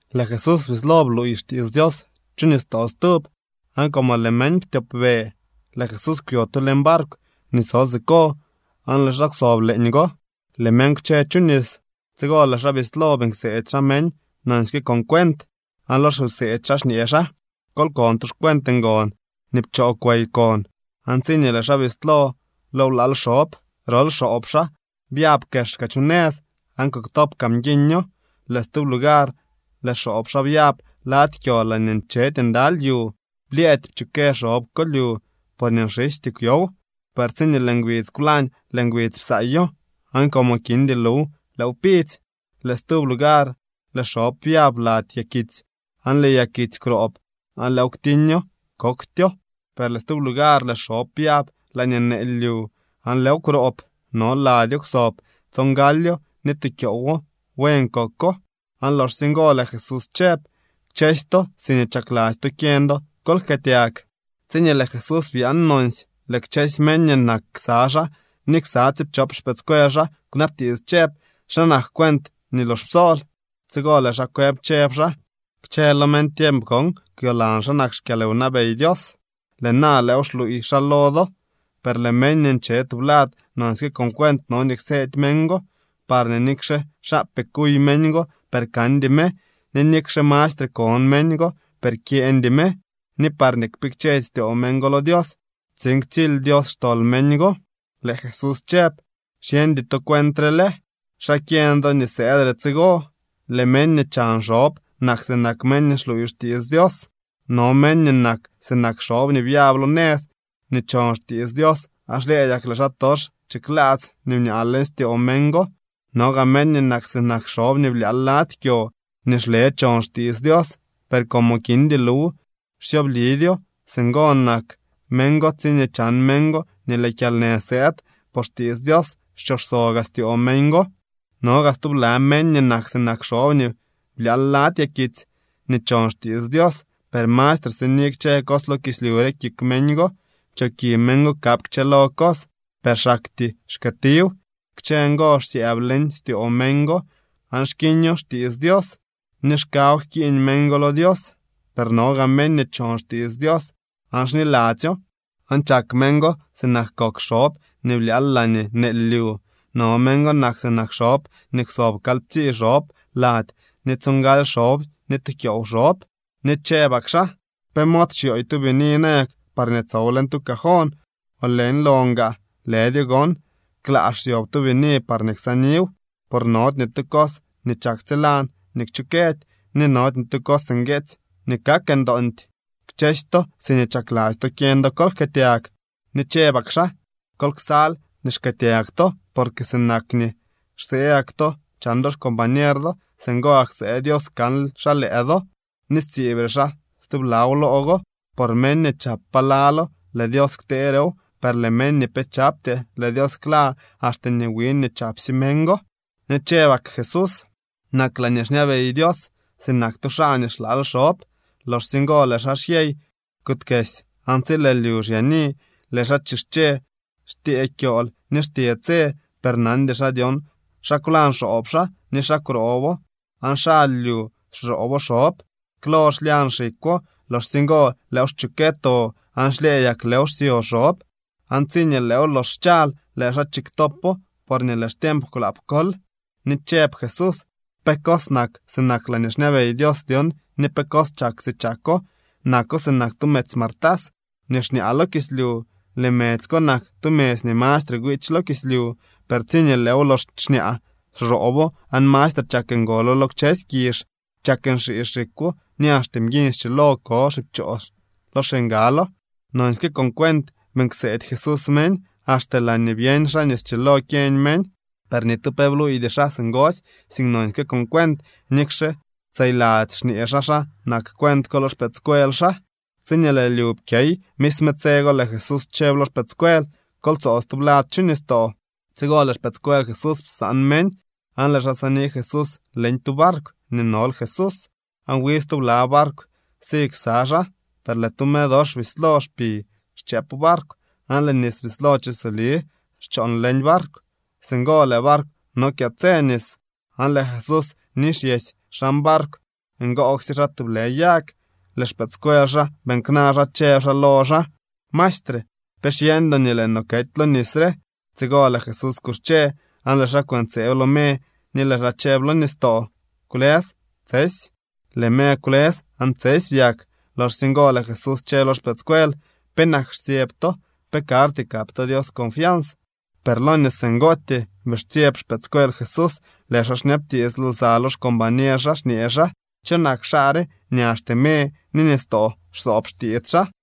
Lëë Jesús bislo bluuy xtiits Dios chu nistoo stub. Aan como lëë meñ ptyopbe, lëë Jesús kwyo tu leñ barkw nii so siko aan lëë xaa kwsob leeñgo. Lëë meñ kwche chu nis. Tsigo lëë xaa bislo beeñ kseedy xaa meñ nonsyke con cuent. Aan lo xiwseedy xaa xñee xaa: —Kol kon tu xcuent ngon nii pchoo kwey kon. Aan tsiñee lëë xaa bislo lo wlaal xob, grol xoob xaa byab kexka chu nëz aan kuktop kaa mguiño. Lëë stub lugar lëë xob byab lady kyo laañee nchedy ndaly yu. Blyëëdy pchukë xob ko lyu porñee nxijty kwyow. Per tsiñee lëë ngbidz kwlañ, lëë ngbidz psaayo, aan como kindy luw lëëw pidzy. Lëë stub lugar lëë xob byab lady yakitsy aan lëë yakitsy kwroob aan lëëw kwtiño koktyo. Per lëë stub lugar lëë xob byab laañee neely lyu aan lëëw kwroob. No ladyo kwsob tsongalyo ni tu kyoowo. Buen koko. Aan loxsye ngo lëë Jesús chëb: —Kchësy to siñee chakladzy to kyeñ do, kol jkëëtyag. Tsiñee lëë Jesús byaan nonsy, lëë kchësy meñ nii nak ksa xaa ni ksa tsiipchop xpëëdscuel xaa kwnabtiits chëb: —¿Xa nak cuent nii lox psool? Tsigo lëë xaa kwëb chëb xaa: —Kchë lo meñ tiemp gon kwyolan xa nak xkyalwnabey Dios. Lëë na lëëw xluuy xaa lo do. Per lëë meñ nii nche tublad nonsyke con cuent no nii kseedy meñ go parñee nikxe xaapee kuy meñ go, per kandy me, ni nikxe mastre kon meñ go, per kyeñdy me, ni parñee kpikchedy styoo meñ go lo Dios tsiin ktsily Dios xtol meñ go. Lëë Jesús chëb: —¿Xyeñdy to cuent re lë? ¿Xa kyeñ do nii sëëdre tsigo? Lëë meñ nii chan xob nak sinak meñ nii xluuy xtiits Dios. No meñ nii nak sinak xob nii byab lo nëz, nii chon xtiits Dios, aan xlyëëdyak lëë xaatox chiklaats nii bñaa leñ styoo meñ go. No gaa meñ nii nak sinak xob nii blyaal lady kyo, nii xle chon xtiits Dios, per como kindy luw xsyob lidyo. Singo nak meñ go tsiñee chan meñ go nii lëë kyalnë sëëd por xtiits Dios. Xchoso gaa styoo meñ go. No gaa stubla meñ nii nak sinak xob nii blyaal lady yakitsy, nii chon xtiits Dios, per mastre sini kchë cos lo kislyu re kik meñ go. Choki meñ go kap kchëlo cos, per xaktyee xkëëtiw. Kchë ngo xsyëëb leñ styoo meñ go aan xkiño xtiits Dios, ni xkaw jkiiñ meñ go lo Dios. Per no gaa meñ nii chon xtiits Dios aan xniladzyo. Aan chak meñ go sinak kok xob nii blyaal laañee neely lyu. No meñ go nak sinak xob nii kwsob kalyptsii xob lady, ni tsongaly xob, ni tu kyoow xob. Ni chëbak xaa: —¿Pe mod xyooy tu bini nayak parñee tsow leñ tu cajón o leñ lon gaa? Lëdyo gon. Klaa xsyob tu bini parñee ksaaniw. Por nody ni tu cos nii chak tsilaan nii kchukëdy, ni nody ni tu cos ngueetsy nii kak ndoondy. Kchësy to siñee chakladzy to kyeñ do, kol jkëëtyag. Ni chëbak xaa: —Kol ksal nii xkëëtyag to, porque sinak nii xsee gak to chan do xcombañer do, singo gak ksee Dios kan xaa lëë do, ni stsiibre xaa stublaw loo go. Por meñ nii chap palalo, lëë Dios kteerew. Per lëë meñ nii pe chapty, lëë Dios kla axte nii wiñ nii chapsye meñ go. Ni chëbak Jesús: —Nak laañee xñabey Dios sinak tu xaa nii xlaal xob. Loxsye ngo lëë xaa xyey kuutkesy aan tsi lëë lyu xyaani lëë xaa chische, xtye kyool ni xtye tse, per nandy xaa dyon xa kwlañ xoob xaa ni xa kwroobo. Aan xaly lyu xroobo xob. Klo xlyañ xikwo. Loxsye ngo lëëw xchukë to aan xlyëëdyak lëëw xsyo xob. Aan tsiñee lëëw lox chal, lëë xaa chiktopo, porñee lëë xtiemp kwlaap kol. Ni chëb Jesús: —¿Pe cos nak sinak laañee xñabey Dios dyon, ni pe cos chak si chako? Nako sinak tu medzy martas nii xñaa lo kislyu. Lëë medzy ko nak tu medzy nii mastre wiich lo kislyu. Per tsiñee lëëw lox xñaa, xroobo aan mastre chak ngolo lo kchësy kizh. Chak nxii xikwo ni axte mguiñ schilo ko xipchoos lo xingalo. Nonsyke con cuent beeñ kseedy Jesús meñ, axte laañee byeñ xaa nii schilo kyeñ meñ. Per ni tu pe bluuydy xaa singosy, sink nonsyke con cuent, nikxe tseyladzy xñee xaa xa nak cuent ko lo xpëëdscuel xaa. Tsiñee lëë lyu pkyey misme tse go, lëë Jesús chëb lo xpëëdscuel: —Kol tsoo stublad chu nistoo. Tsigo lëë xpëëdscuel Jesús psaan meñ, aan lëë xaa sini Jesús leñ tu barkw nii nol Jesús. Aan wi stubla barkw si ksa xaa. Per lëë tu me dox bislo xpi xchëëp barkw, aan lëë nis bislo chisoli xchoon leñ barkw. Singo lëë barkw no kyatsë nis. Aan lëë Jesús nixyesy xan barkw ngookwsye xaa tublë yag. Lëë xpëëdscuel xaa beeñ kna xaa chëb xaa lo xaa: —¡Maestre! ¿Pe xyeñdyoo nii lëë no kety lo nis re? Tsigo lëë Jesús kuxche aan lëë xaa kwëntseeb lo me ni lëë xaa chëb lo nistoo: —¡Kwlës! ¡Tsesy! Lëë me kwlës aan tsesy byak. Loxsye ngo lëë Jesús chëb lo xpëëdscuel: —¿Penak xtsyeb to? ¿Pe karty kap to Dios confians? Per loñee singootyee bii xtsyeb xpëëdscuel Jesús, lëë xaa xñabtiits lsa xaa lo xcombañer xaa xñee xaa: —¿Cho nak xaa re nii axte me ni nistoo xsoob xtiits xaa?